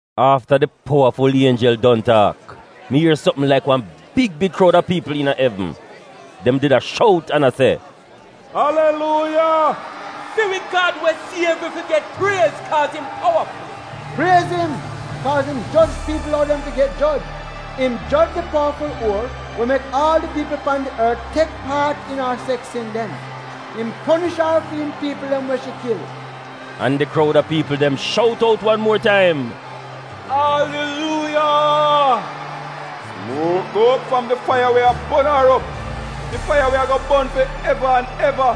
Afta di powaful ienjel don taak, mi ier sopm laik wan big big kroud a piipl iina evn. Dem did a shout an a se: “Aliluuya! Fi wi Gad we siev wi fi get priez kaaz im powaful. Priez im kaaz im joj piipl ou dem fi get joj. Im joj di powaful uor we mek aal di piipl pan di ort tek paat iina ar seks sin dem. Im ponish ar fi'im piipl dem we shi kil.” An di kroud a piipl dem shout out wan muor taim: “Aliluuya! Sumuok go op fram di faiya we a bon ar op, di faiya we ago bon fi eva an eva.”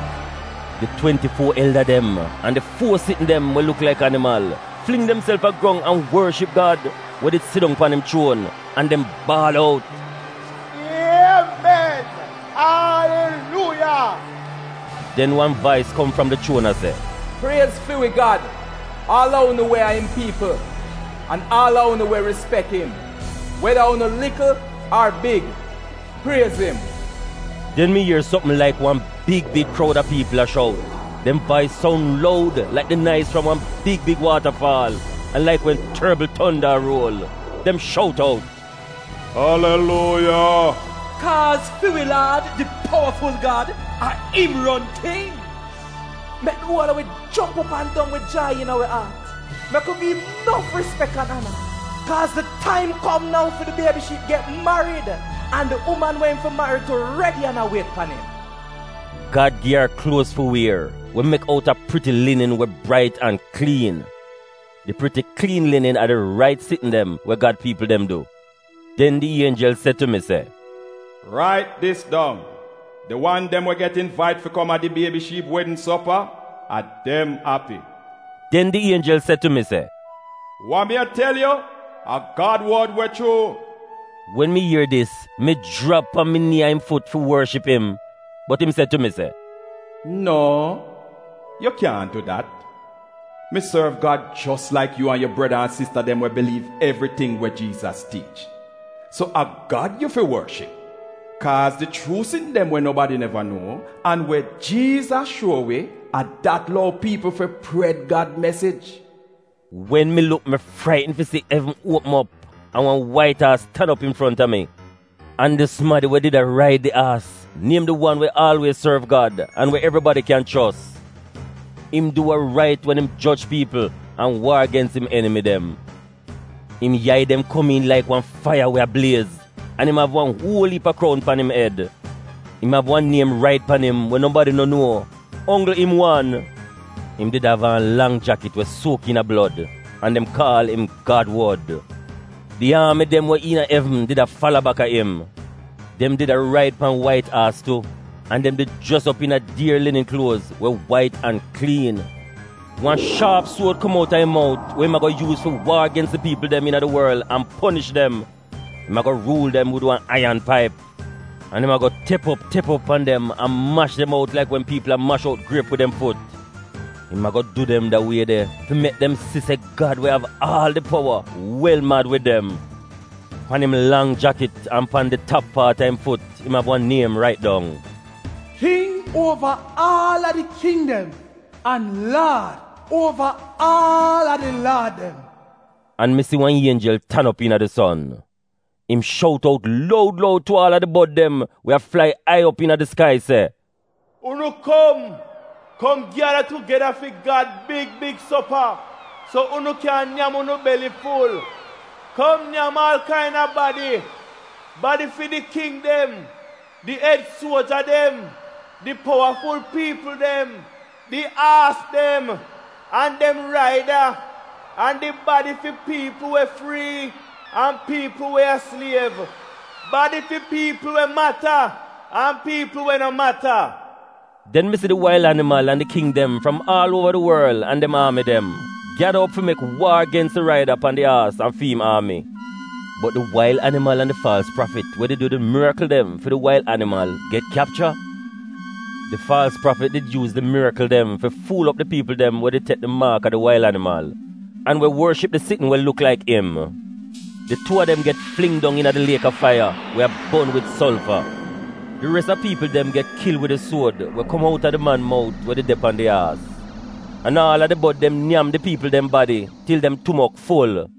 Di twenti-fuo elda dem an di fuo sitn dem (we luk laik animal) fling demself a grong an worship Gad, we did sidong pan im chuon, an dem baal out: “Iemen, Aliluuya!” Den wan vais kom fram di chuon a se, “Priez fi wi Gad, aal a unu we a im piipl, an aal a unu we rispek im, weda unu likl ar big, priez im!” Den mi ier sopm laik wan big, big kroud a piipl a shout, dem vais soun loud laik di naiz fram wan big big waatafaal, an laik wen torbl tonda a ruol, dem shout out: “Aliluuya! Kaaz fi wi Laad, di powaful Gad, a im ron tingz. Mek di uol a wi jomp op an dong wid jai iina wi aat. Mek wi gi'im nof rispek an ana! Kaaz di taim kom nou fi di Biebi Shiip get marid, an di uman we im fi marid tu, redi an a wiet pan im. Gad gi ar kluoz fi wier, we mek outa priti linin we brait an kliin.” (Di priti kliin linin a di rait sitn dem we Gad piipl dem du.) Den di ienjel se tu mi, “Rait dis dong: ‘Di wan dem we get invait fi kom di Biebi Shiip wedn sopa, a dem api.” Den di ienjel se tu mi, “Wa mi a tel yu, a Gad wod we chuu.” Wen mi ier dis, mi jrap pan mi nii a im fut fi worship im. Bot im se tu mi se, “No, yu kyaahn du dat! Mi sorv Gad jos laik yu an yu breda an sista dem we biliiv evriting we Jiizas tiich. So a Gad yu fi worship, kaaz di chuu sitn dem we nobadi neva nuo an we Jiizas shuo wi, a dat lou piipl fi pred Gad mesij!” Wen mi luk, mi fraitn fi si evn uopm op an wan wait aas tan op im infronta mi. An di sumadi we did a raid di aas niem di Wan we Aalwiez Sorv Gad an di Wan we Evribadi Kyan Chos. Im du wa rait wen im joj piipl an waar gens im enimi dem. Im yai dem kom laik wan faiya we a bliez, an im av wan uol iip a kroun pan im ed. Im av wan niem rait pan im we nobadi no nuo, onggl im wan. Im did av aan lang jakit we suok iina blod, an dem kaal im Gad wod. Di aami dem we iina evn did a fala baka im. Dem did a raid pan wait aas tu an dem did jres op iina dier linin kluoz we wait an kliin. Wan shaap suod kom outa im mout we im ago yuuz fi waar gens di piipl dem iina di worl an ponish dem. “Im ago ruul dem wid wan aiyan paip.” An im ago tep op, tep op pan dem an mash dem out laik wen piipl a mash op griep wid dem fut. Im ago du dem da wie de fi mek dem si se Gad we av aal di powa, wel mad wid dem. Pan im lang jakit an pan di tap paat a im fut im av wan niem rait dong: KING UOVA AAL A DI KING DEM AN LAAD UOVAAALADILAAD DEM. An mi si wan ienjel tan op iina di son. Im shout out loud loud tu aal a di bod dem we a flai ai op iina di skai se, “Unu kum, kum gyada tugeda fi Gad big big sopa, so unu kyan nyam unu beliful. Kum nyam aal kaina badi: badi fi di king dem, di ed suoja dem, di powaful piipl dem, di aas dem an dem raida an di badi fi piipl we frii an piipl we a sliev, badi fi piipl we mata an piipl we no mata.” Den mi si di wail animal an di king dem fram aal uova di worl an dem aami dem gyada op fi mek waar gens di raida pan di aas an fi im aami. Bot di wail animal an di faalz prafit we did du di mirikl dem fi di wail animal get kyapcha. Di faalz prafit did yuuz di mirikl dem fi fuul op di piipl dem we did tek di maak a di wail animal an di sitn we dem mek fi luk laik im fi piipl worship. Di tuu a dem get fling dong iina di liek a faiya we a bon wid solfa. Di res a piipl dem get kil wid di suod we kom outa di man we did de pan di aas mout. An aal a di bod dem nyam di badi a di piipl dem til dem tumok ful.